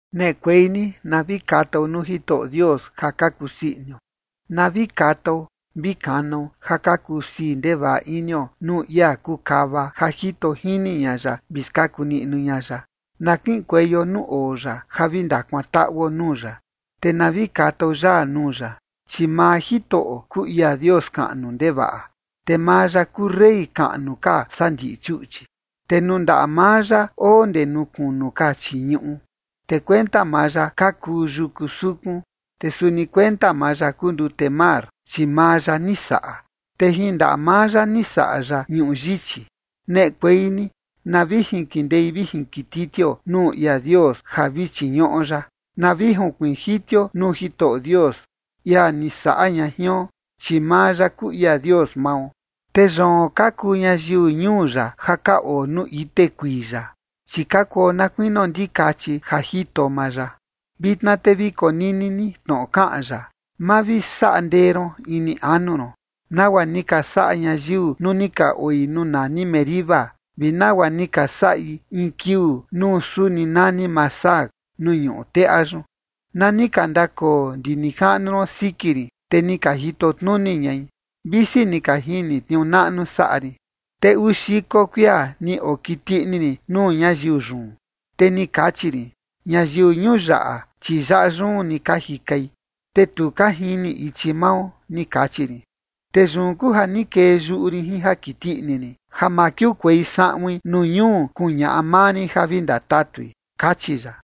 Neꞌekuei ni na vi katao nuu Jitoꞌo Dios ja ka kusii inio, na vi katao vi kanao ja ka kusii ndevaꞌa inio nuu ia kuu kava ja jito jini ña ya vi skaku niꞌnu ña ya. Na kiꞌinkueio nuu oo ya, ja vi ndakuantaꞌuo nuu ya. Te na vi katao yaa nuu ya. Chi maa Jitoꞌo kuu ia Dios kaꞌnu ndevaꞌa, te maa ya kuu rey kaꞌnu ka saa ndiꞌi chuꞌchi. Te nuu ndaꞌa maa ya oo ndee nuu kunu ka chii ñuꞌu, te kuenta maa ya ka kuu yuku sukun. Te suni kuenta maa ya kuu ndute mar, chi maa ya ni saꞌa, te jin ndaꞌa maa ya ni saꞌa ya ñuꞌu yichi. Neꞌekuei ni na vi jinkindei vi jinkititio nuu ia Dios, ja vi chiñuꞌo ya. Na vi junkuiin jitio nuu Jitoꞌo Dios, ia ni saꞌa ña jion. Chi maa ya kuu ia Dios mao, te yoon ka kuu ñayiu ñuu ya ja ka oo nuu ite kuii ya, chi ka kuo na kuinio ndikachi ja jito maa ya. Vitna te vi konini ni tnoꞌo kaꞌan ya: Ma vi saꞌa ndee ron ini anu ron, nagua ni ka saꞌa ñayiu nuu ni ka oi nuu nani Meriba, vi nagua ni ka saꞌi in kiuu nuu suni nani Masah nuu ñuꞌu teꞌa yun, na ni ka ndakoo ndi nijaꞌnu ron siki rin, te ni ka jito tnuni ñai, visi ni ka jini tniuu naꞌnu saꞌa rin. Te uu xiko kuia ni okiti ini rin nuu ñayiu yun, te ni kachi rin: “Ñayiu ñuu yaꞌa, chi yaꞌa yun ni ka jikai, te tu ka jini ichi mao”, ni kachi rin. Te yun kuu ja ni kee yuꞌu rin jin ja kiti ini rin, ja ma kiukuei saꞌuin nuu ñuu kuñaꞌa maa rin ja vi ndatatui, kachi ya.